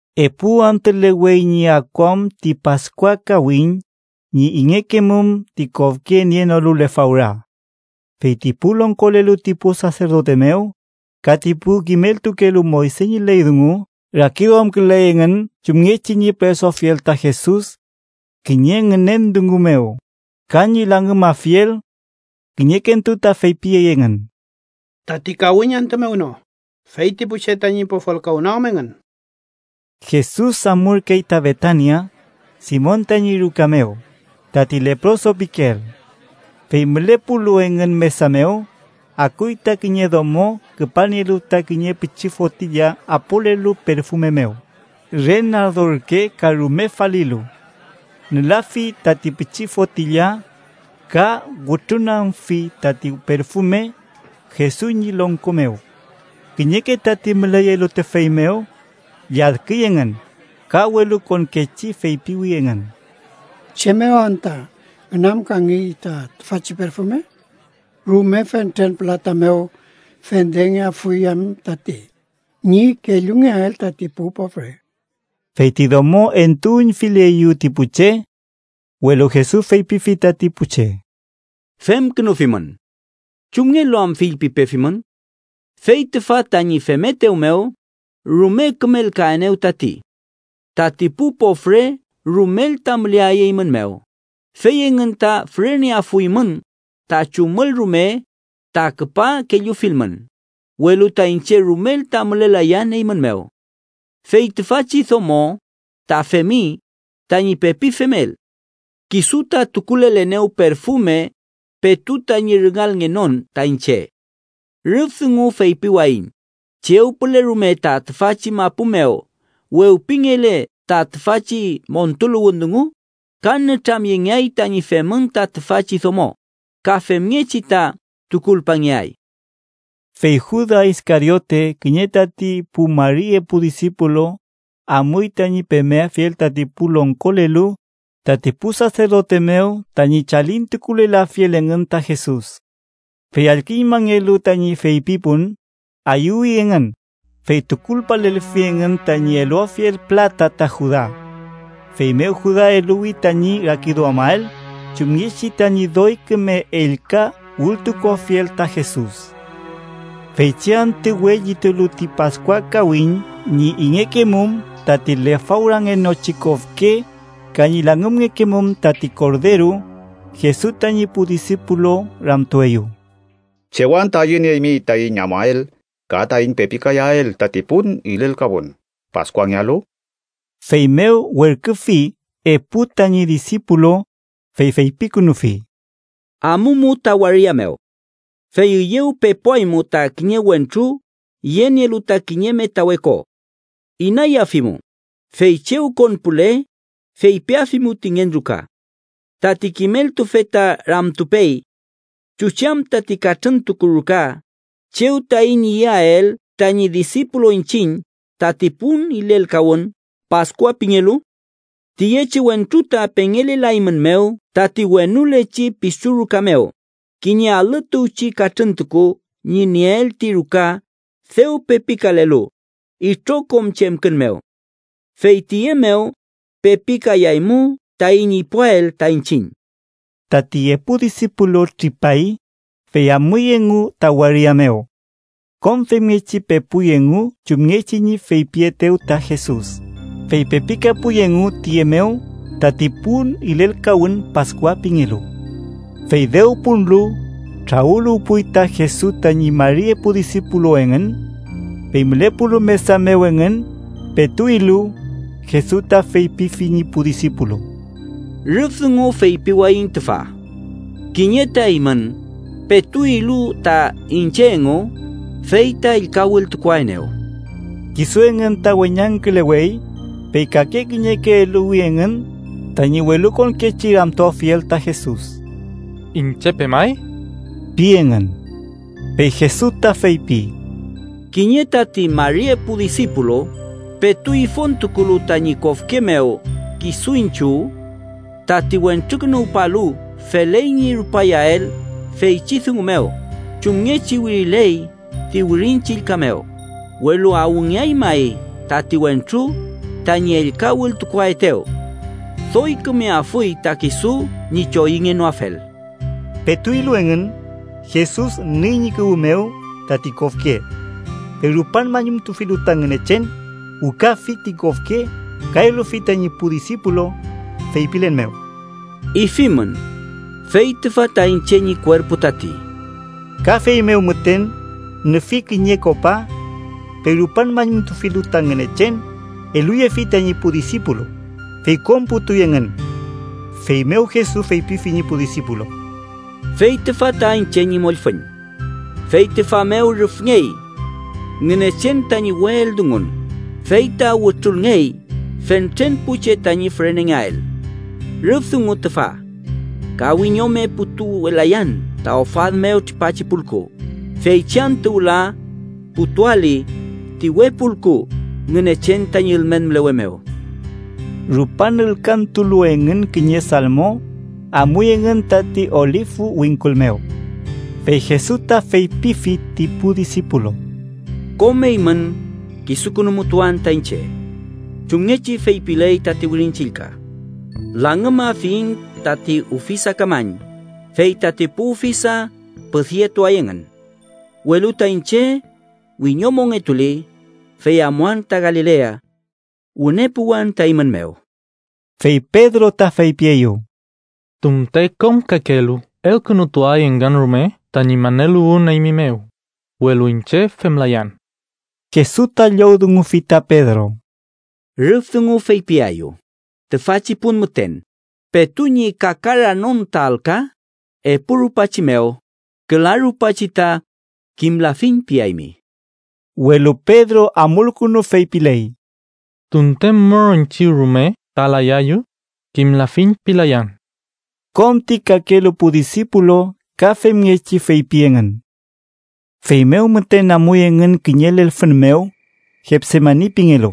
Epu antülewey ñi akuam ti Paskua kawiñ, ñi ingekemum ti kofke nienolu lefawra. Fey ti pu longkolelu ti pu saserdote mew ka ti pu kimeltukelu Moyse ñi ley dungu rakiduamküley engün chumngechi ñi püresuafiel ta Jesus kiñe ngünen dungu mew, ka ñi langümafiel. Kiñekentu ta feypiyey engün: “Tati kawiñ antü mew no, fey ti pu che tañi pofolkawnoam engün.” Jesus amurkey ta Betania, Simon tañi ruka mew, tati leproso pikeel. Fey mülepulu engün mesa mew, akuy ta kiñe domo küpalnielu ta kiñe pichi fotilla apolelu perfume mew re nardo ürke ka rume falilu. Nülafi tati pichi fotilla ka wütrunagümfi tati perfume Jesus ñi longko mew. Kiñeke tati müleyelu tüfey mew lladküy engün, ka welukonkechi feypiwi engün: —¿Chem mew anta ngünamkangey ta tüfachi perfume? Rume fentren pülata mew fendengeafuy em tati, ñi kellungeael tati pu pofre. Fey ti domo entuüñfileyew ti pu che. Welu Jesus feypifi tati pu che: —Femkünufimün. ¿Chumngelu am fillpipefimün? Fey tüfa tañi femetew mew, rume kümelkaenew tati. Tati pu pofre rumel ta müleay eymün mew, fey engün ta füreneafuymün ta chumül rume ta küpa kellufilmün, welu ta iñche rumel ta mülelayan eymün mew. Fey tüfachi domo ta femi tañi pepi femel: kisu ta tukulelenew perfume petu tañi rüngalngenon ta iñche. Rüf dungu feypiwayiñ chew püle rume ta tüfachi mapu mew wewpingele ta tüfachi montuluwün dungu, ka nütramyengeay tañi femün ta tüfachi domo, ka femngechi ta tukulpangeay. Fey Juda Iskariote, kiñe tati pu mari epu disipulu, amuy tañi pemeafiel tati pu longkolelu tati pu saserdote mew tañi chalintukulelafiel engün ta Jesus. Fey allküñmangelu tañi feypipun, ayüwi engün, fey tukulpalelfi engün tañi eluafiel pülata ta Juda. Feymew Juda eluwi tañi rakiduamael chumngechi tañi doy küme ellka wültukuafiel ta Jesus. Feychi antü we llitulu ti Paskua kawiñ ñi ingekemum tati lefawrangenochi kofke ka ñi langümngekemum tati korderu, Jesus tañi pu disipulu ramtueyew: —¿Chew anta ayünieymi taiñ amuael ka taiñ pepikayael tati pun ilelkawün Paskuangealu? Feymew werküfi epu tañi disipulu, fey feypikünufi: —Amumu ta waria mew. Fey üyew pepuaymu ta kiñe wentru yenielu ta kiñe metawe ko. Inayafimu, fey chew konpule, feypiafimu ti ngen ruka: ‘Tati kimeltufe ta ramtupey: ¿Chuchi am tati katrüntuku ruka chew taiñ iyael tañi disipulu iñchiñ tati pun ilelkawün Paskua pingelu?’ Tiyechi wentru ta pengelelaeymumew tati wenulechi pisu ruka mew, kiñe alü tuwchi katrüntuku ñi nieel ti ruka dew pepikalelu itrokom chemkün mew. Fey tiye mew pepikayaymu taiñ ipuwael ta iñchiñ. Tati epu disipulu tripay, fey amuy engu ta waria mew. Kom femngechi pepuy engu chumngechi ñi feypietew ta Jesus, fey pepikapuy engu tiye mew tati pun ilelkawün Paskua pingelu. Fey dew punlu, trawüluwpuy ta Jesus tañi mari epu disipulu engün. Fey mülepulu mesa mew engün, petu ilu, Jesus ta feypifi ñi pu disipulu: —Rüf dungu feypiwayiñ tüfa: kiñe ta eymün, petu ilu ta iñche engu, fey ta ellka wültukuaenew. Kisu engün ta weñangkülewey, fey kake kiñeke eluwi engün tañi welukonkechi ramtuafiel ta Jesus: —¿Iñche pemay? ―pi engün. Fey Jesus ta feypi: —Kiñe tati mari epu disipulu, petu ifontukulu tañi kofke mew kisu iñchiw. Tati Wentrukünuwpalu feley ñi rupayael feychi dungu mew chumngechi wiriley ti Wirin Chillka mew, welu ¡awngeay may tati wentru tañi ellka wültukuaetew! Doy kümeafuy ta kisu ñi choyüngenoafel. Petu ilu engün, Jesus nüy ñi kuwü mew tati kofke. Fey rupan mañumtufilu ta Ngünechen, wükafi ti kofke ka eluyefi tañi pu disipulu, feypilen mew: —Ifimün, fey tüfa ta iñche ñi kuerpu tati. Ka feymew müten nüfi kiñe kopa. Fey rupan mañumtufilu ta Ngünechen, eluyefi tañi pu disipulu, fey kom putuy engün. Feymew Jesus feypifi ñi pu disipulu: —Fey tüfa ta iñche ñi mollfüñ. Fey tüfa mew rüfngey Ngünechen tañi we eldungun, fey ta wütrulngey fentren pu che tañi fürenengeael. Rüf dungu tüfa: ka wiñome putuwelayan ta ofad mew tripachi pulku, feychi antü wüla putuali ti we pulku Ngünechen tañi ülmen mülewe mew. Rupan ülkantulu engün kiñe salmo, amuy engün tati Olifu wingkul mew. Fey Jesus ta feypifi ti pu disipulu: —Kom eymün kisukünumutuan ta iñche. Chumngechi feypiley tati Wirin Chillka: ‘Langümafiñ tati ufisakamañ, fey tati pu ufisa püdyetuay engün.’ Welu ta iñche wiñomongetuli, fey amuan ta Galilea. Wüne puwan ta eymün mew. Fey Pedro ta feypieyew: —Tunte kom kakelu elkünutuay engün rume tañi maneluwün eymi mew, welu iñche femlayan. Jesus ta llowdungufi ta Pedro: —Rüf dungu feypiaeyu, tüfachi pun müten, petu ñi kakaranon ta alka epu rupachi mew, küla rupachi ta ‘kimlafiñ’ piaymi. Welu Pedro amulkünu feypiley: —Tunte mür iñchiw rume ta layayu, ‘kimlafiñ’ pilayan. Kom ti kakelu pu disipulu ka femngechi feypi engün. Feymew müten amuy engün kiñe lelfün mew, Getsemani pingelu.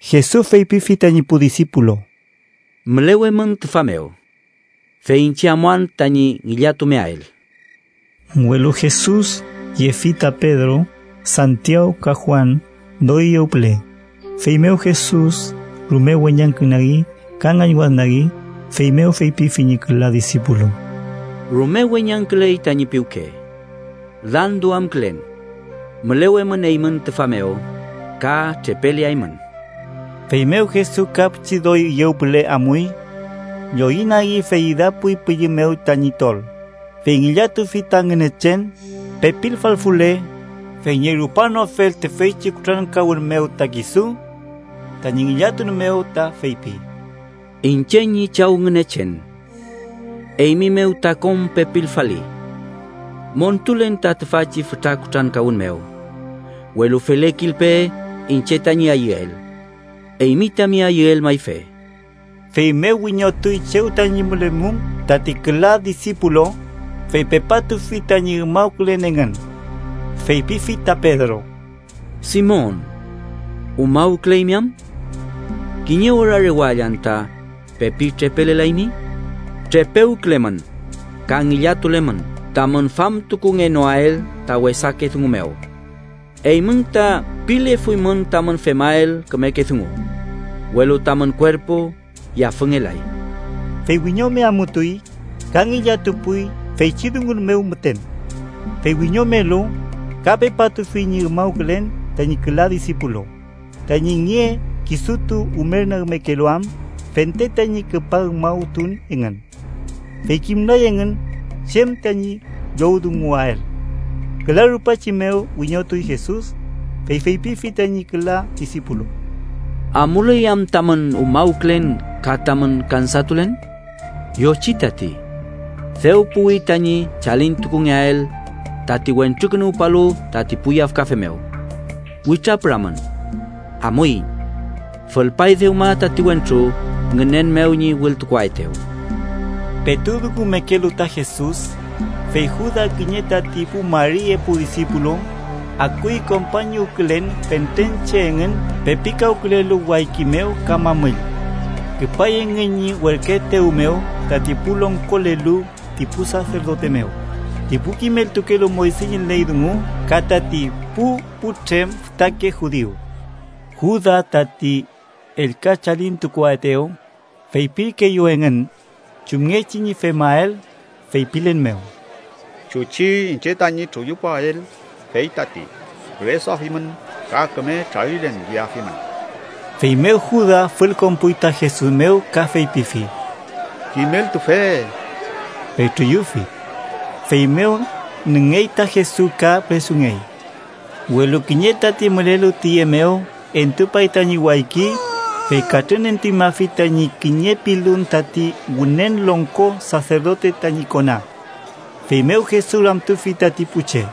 Jesus feypifi tañi pu disipulu: —Mülewemün tüfa mew, fey iñche amuan tañi ngillatumeael. Welu Jesus yefi ta Pedro, Santiaw ka Juan doy üyew püle, feymew Jesus rume weñangkünagi ka ngañwadnagi. Feymew feypifi ñi küla disipulu: —Rume weñangküley tañi piwke. Landuamkülen. Mülewemün eymün tüfa mew, ka trepeleaymün. Feymew Jesus ka pichi doy üyew püle amuy. Lloyünagi fey idapuy pülli mew tañi tol, fey ngillatufi ta Ngünechen, pepilfalfule, fey ñi rupanoafel tüfeychi kutrankawün mew ta kisu. Tañi ngillatun mew ta feypi: “Iñche ñi Chaw Ngünechen, eymi mew ta kom pepilfali. Montulen ta tüfachi fütra kutrankawün mew, welu felekilpe iñche tañi ayüel, eymi tami ayüel mayfe.” Feymew wiñotuy chew tañi mülemum tati küla disipulu, fey pepatufi tañi umawkülen engün. Feypifi ta Pedro: —Simon, ¿umawküleymi am? ¿Kiñe ora rewall anta pepi trepelelaymi? Trepewkülemün ka ngillatulemün tamün famtukungenoael ta wesake dungu mew. Eymün ta pilefuymün tamün femael kümeke dungu, welu tamün kuerpu yafüngelay. Fey wiñome amutuy, ka ngillatupuy feychi dungun mew müten. Fey wiñomelu, ka pepatufi ñi umawkülen tañi küla disipulu, tañi nge kisutu umernagmekelu am fente tañi küpa umawtun engün. Fey kimlay engün chem tañi llowdunguael. Küla rupachi mew wiñotuy Jesus, fey feypifi tañi küla disipulu: —¿Amuley am tamün umawkülen ka tamün kansatulen? Yochi tati. Dew puwi tañi chalintukungeael tati Wentrukünuwpalu tati pu yafkafe mew. Witrapüramün. Amuiñ. Fülpay dewma tati wentru ngünen mew ñi wültukuaetew. Petu dungumekelu ta Jesus, fey Juda, kiñe tati pu mari epu disipulu, akuy kompañuwkülen fentren che engün pepikawkülelu wayki mew ka mamüll. Küpay engün ñi werküetew mew tati pu longkolelu ti pu saserdote mew, ti pu kimeltukelu Moyse ñi ley dungu ka tati pu putrem fütake judiu. Juda, tati ellka chalintukuaetew, feypirkeeyew engün chumngechi ñi femael, feypilen mew: “Chuchi iñche tañi truyupuael, fey tati. Püresuafimün ka küme trarilen yeafimün.” Feymew Juda fülkonpuy ta Jesus mew ka feypifi: —¡Kimeltufe! Fey truyufi. Feymew nüngey ta Jesus ka püresungey. Welu kiñe tati mülelu tiye mew entupay tañi wayki, fey katrünentuñmafi tañi kiñe pilun tati Wünen Longko Saserdote tañi kona. Feymew Jesus ramtufi tati pu che: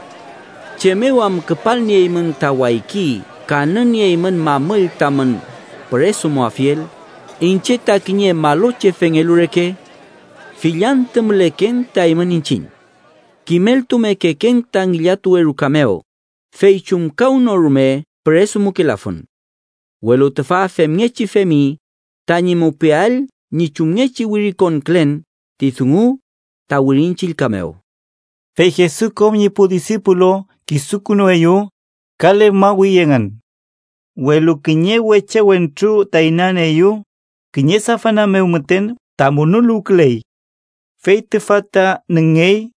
—¿Chem mew am küpalnieymün ta wayki ka nünieymün mamüll tamün püresumuafiel, iñche ta kiñe malochefengelu reke? Fill antü müleken ta eymün iñchiñ. Kimeltumekeken ta ngillatuwe ruka mew, fey chumkawnorume püresumukelafun. Welu tüfa femngechi femi tañi mupiael ñi chumngechi wirikonkülen ti dungu ta Wirin Chillka mew. Fey Jesus kom ñi pu disipulu kisukünueyew, ka lefmawi engün. Welu kiñe weche wentru ta inanieeyew, kiñe safana mew müten ta munuluwküley. Fey tüfa ta nüngey,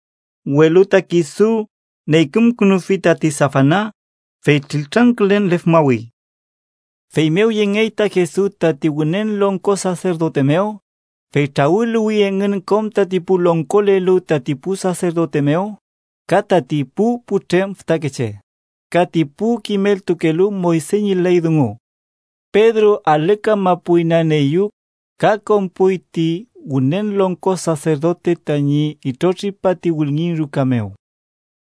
welu ta kisu neykümkünufi tati safana, fey triltrangkülen lefmawi. Feymew yengey ta Jesus tati Wünen Longko Saserdote mew, fey trawüluwi engün kom tati pu longkolelu tati pu saserdote mew, ka tati pu putrem fütakeche ka ti pu kimeltukelu Moyse ñi ley dungu. Pedro alü kamapu inanieeyew ka konpuy ti Wünen Longko Saserdote tañi itrotripa ti wülngin ruka mew.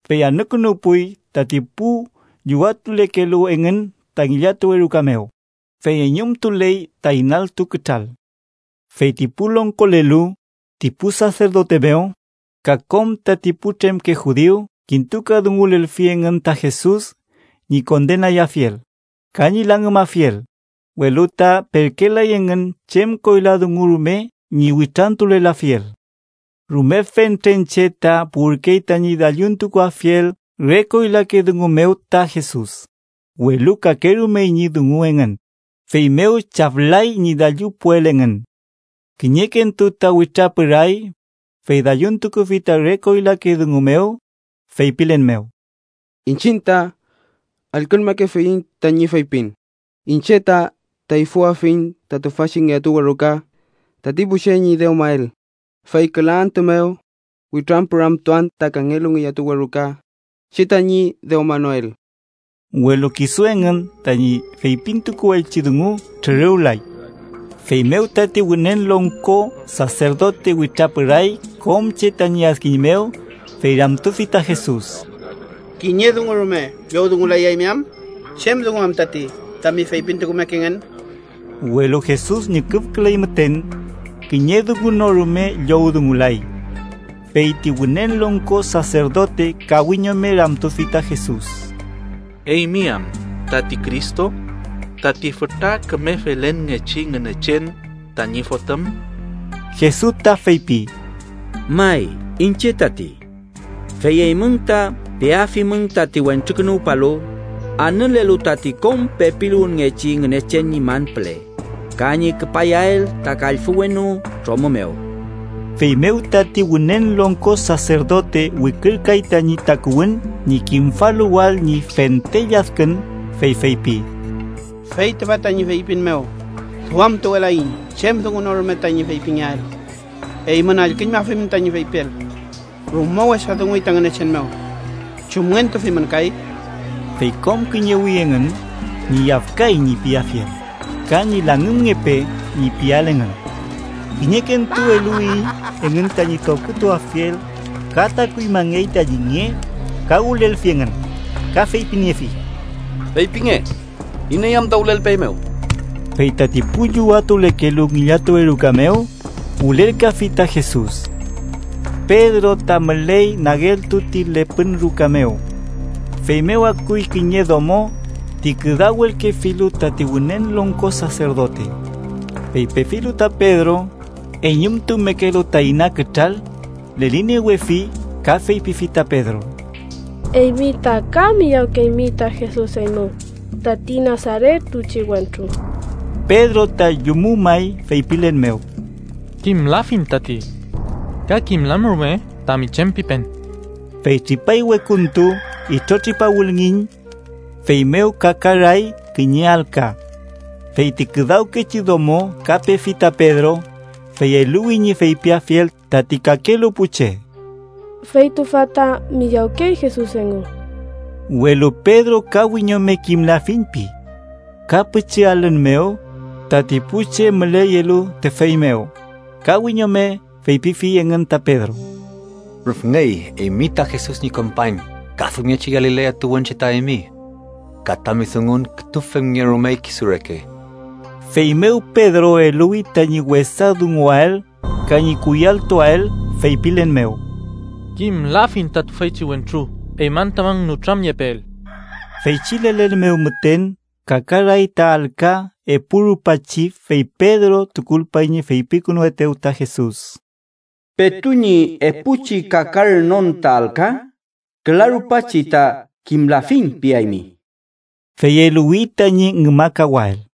Fey anükünuwpuy tati pu llüwatulekelu engün ta ngillatuwe ruka mew, fey eñumtuley ta inaltu kütral. Fey ti pu longkolelu ti pu saserdote mew ka kom tati putremke judiu kintukadungulelfi engün ta Jesus ñi kondenayafiel ka ñi langümafiel, welu ta perkelay engün chem koyla dungu rume ñi witrantulelafiel. Rume fentren che ta puwürkey tañi dalluntukuafiel re koylake dungu mew ta Jesus, welu kakerumey ñi dungu engün, feymew chaflay ñi dallupuel engün. Kiñekentu ta witrapüray, fey dalluntukufi ta re koylake dungu mew, feypilen mew: —Iñchiñ ta allküñmakefiyiñ tañi feypin: ‘Iñche ta teyfüafiñ ta tüfachi ngillatuwe ruka tati pu che ñi dewmael, fey küla antü mew witrañpüramtuan ta kangelu ngillatuwe ruka che tañi dewmanoel.’ Welu kisu engün tañi feypintukuelchi dungu trüruwlay. Feymew tati Wünen Longko Saserdote witrapüray kom che tañi adkiñ mew, fey ramtufi ta Jesus: —¿Kiñe dungu rume llowdungulayaymi am? ¿Chem dungu am tati tami feypintukumekengen? Welu Jesus ñüküfküley müten. Kiñe dungu no rume llowdungulay. Fey ti Wünen Longko Saserdote ka wiñome ramtufi ta Jesus: —¿Eymi am tati Cristo, tati fütra küme felenngechi Ngünechen tañi Fotüm? Jesus ta feypi: —May, iñche tati. Fey eymün ta peafimün tati Wentrukünuwpalu anülelu tati kom pepiluwünngechi Ngünechen ñi man püle ka ñi küpayael ta kallfü wenu tromü mew. Feymew tati Wünen Longko Saserdote wikürkay tañi takuwün ñi kimfaluwael ñi fente lladkün, fey feypi: —Fey tüfa tañi feypin mew duamtuwelaiñ chem dungu no rume tañi feypingeael. Eymün allküñmafimün tañi feypiel. Rume wesa dunguy ta Ngünechen mew. ¿Chumngentufimün kay? Fey kom kiñewi engün ñi “yafkay” ñi piafiel ka ñi “langümngepe” ñi piael engün. Kiñekentu eluwi engün tañi tofkütuafiel, ka takuñmangey tañi nge ka wülelfi engün, ka feypiniefi: —¡Feypinge iney am ta wülelpeeymew! Fey tati pu llüwatulekelu ngillatuwe ruka mew wülelkafi ta Jesus. Pedro ta müley nageltu ti lepün ruka mew. Feymew akuy kiñe domo ti küdawelkefilu tati Wünen Longko Saserdote. Fey pefilu ta Pedro, eñumtumekelu ta ina kütral, leliniewefi ka feypifi ta Pedro: —Eymi ta ka miyawkeymi ta Jesus eymu, tati Nasaret tuwchi wentru. Pedro ta llumumay, feypilen mew: —Kimlafiñ tati. Ka kimlan rume tami chem pipen. Fey tripay wekuntu, itrotripa wülngiñ. Feymew kakaray kiñe alka. Fey ti küdawkechi domo ka pefi ta Pedro, fey eluwi ñi feypiafiel tati kakelu pu che: —Fey tüfa ta miyawkey Jesus engu. Welu Pedro ka wiñome “kimlafiñ” pi. Ka pichi alün mew, tati pu che müleyelu tüfey mew ka wiñome feypifi engün ta Pedro: —Rüfngey eymi ta Jesus ñi kompañ, ka femngechi Galilea tuwünche ta eymi. Ka tami dungun kütu femngerumey kisu reke. Feymew Pedro eluwi tañi wesa dunguael ka ñi kuyalltuael, feypilen mew: —¡Kimlafiñ ta tüfeychi wentru eymün tamün nütramyepeel! Feychi lelen mew müten kakaray ta alka epu rupachi, fey Pedro tukulpay ñi feypikünuetew ta Jesus: “Petu ñi epuchi kakaranon ta alka, küla rupachi ta ‘kimlafiñ’ piaymi.” Fey eluwi tañi ngümakawael.